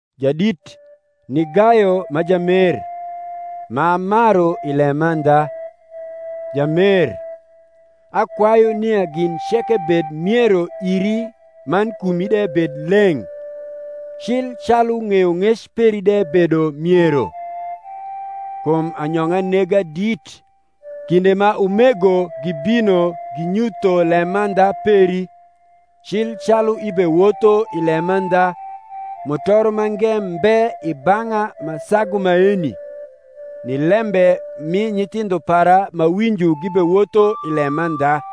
Jadit ni Gayo ma jamer, m’amaru i lemandha. Jamer, akwayu nia gin ceke bed miero iri man kumi de bed leng’, cil calu ng’eyong’ec peri de bedo miero. Kum anyong’a nega dit, kinde ma umego gibino ginyutho lemandha peri, cil calu ibewotho i lemandha. Mutoro mange mbe i bang’a ma sagu maeni, ni lembe mi nyithindho para m’awinjo gibewotho i lemandha.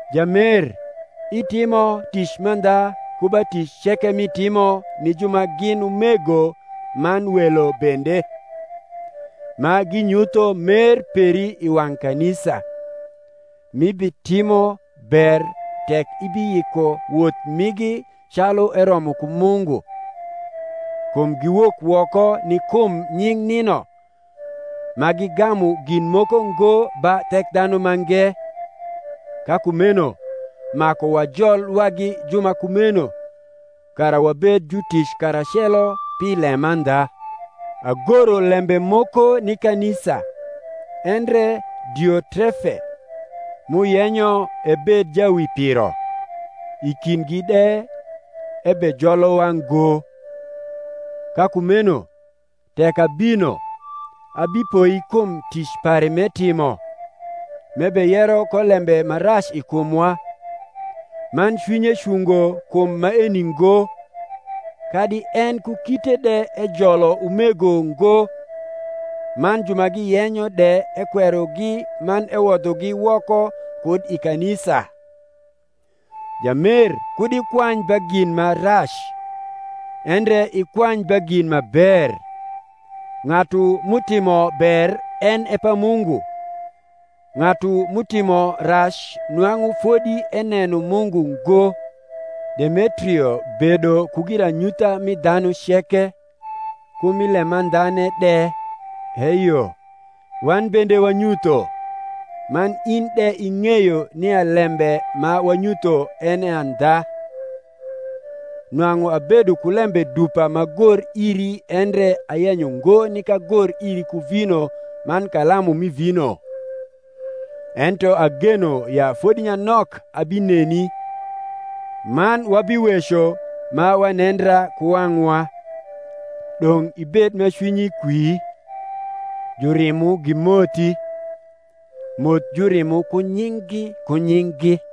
Jamer, itimo tic mandha ku ba tic ceke m’itimo ni ju ma gin umego man welo bende; ma ginyutho mer peri i wang’ kanisa: m’ibitimo ber tek ibiyiko woth migi calu eromo ku Mungu: kum giwok woko ni kum Nying’ nino, ma gigamu gin moko ngo ba Thekdhanumange. Ka kumeno maku wajol wagi ju ma kumeno, kara wabed jutic karacelo pi lemandha. Agoro lembe moko ni kanisa: endre Diotrefe, m’uyenyo ebed jawipiro, i kindgi de, ebejolowa ngo. Ka kumeno, tek abino, abipoi kum tic pare m’etimo, m’ebeyero ko lembe ma rac i kumwa: man cwinye cungo kum maeni ngo, kadi en ku kite de ejolo umego ngo, man ju ma giyenyo de ekwerogi man ewodhogi woko kud i kanisa. Jamer kud ikwany ba gin ma rac, endre ikwany ba gin ma ber. Ng’atu m’utimo ber en e pa Mungu: ng’atu m’utimo rac nwang’u fodi eneno Mungu ngo. Demetrio bedo ku giranyutha mi dhanu ceke, ku mi lemandhane de: eyo, wan bende wanyutho; man in de ing’eyo nia lembe ma wanyutho en e andha. Nwang’u abedo ku lembe dupa m’agor iri endre ayenyo ngo nik agor iri ku vino man kalamu mi vino: ento ageno ya fodi nyanok abineni, man wabiweco ma wanendra ku wang’wa. Dong’ ibed ma cwinyi kwi. Jurimo gimothi. Moth jurimo ku nying’gi ku nying’gi.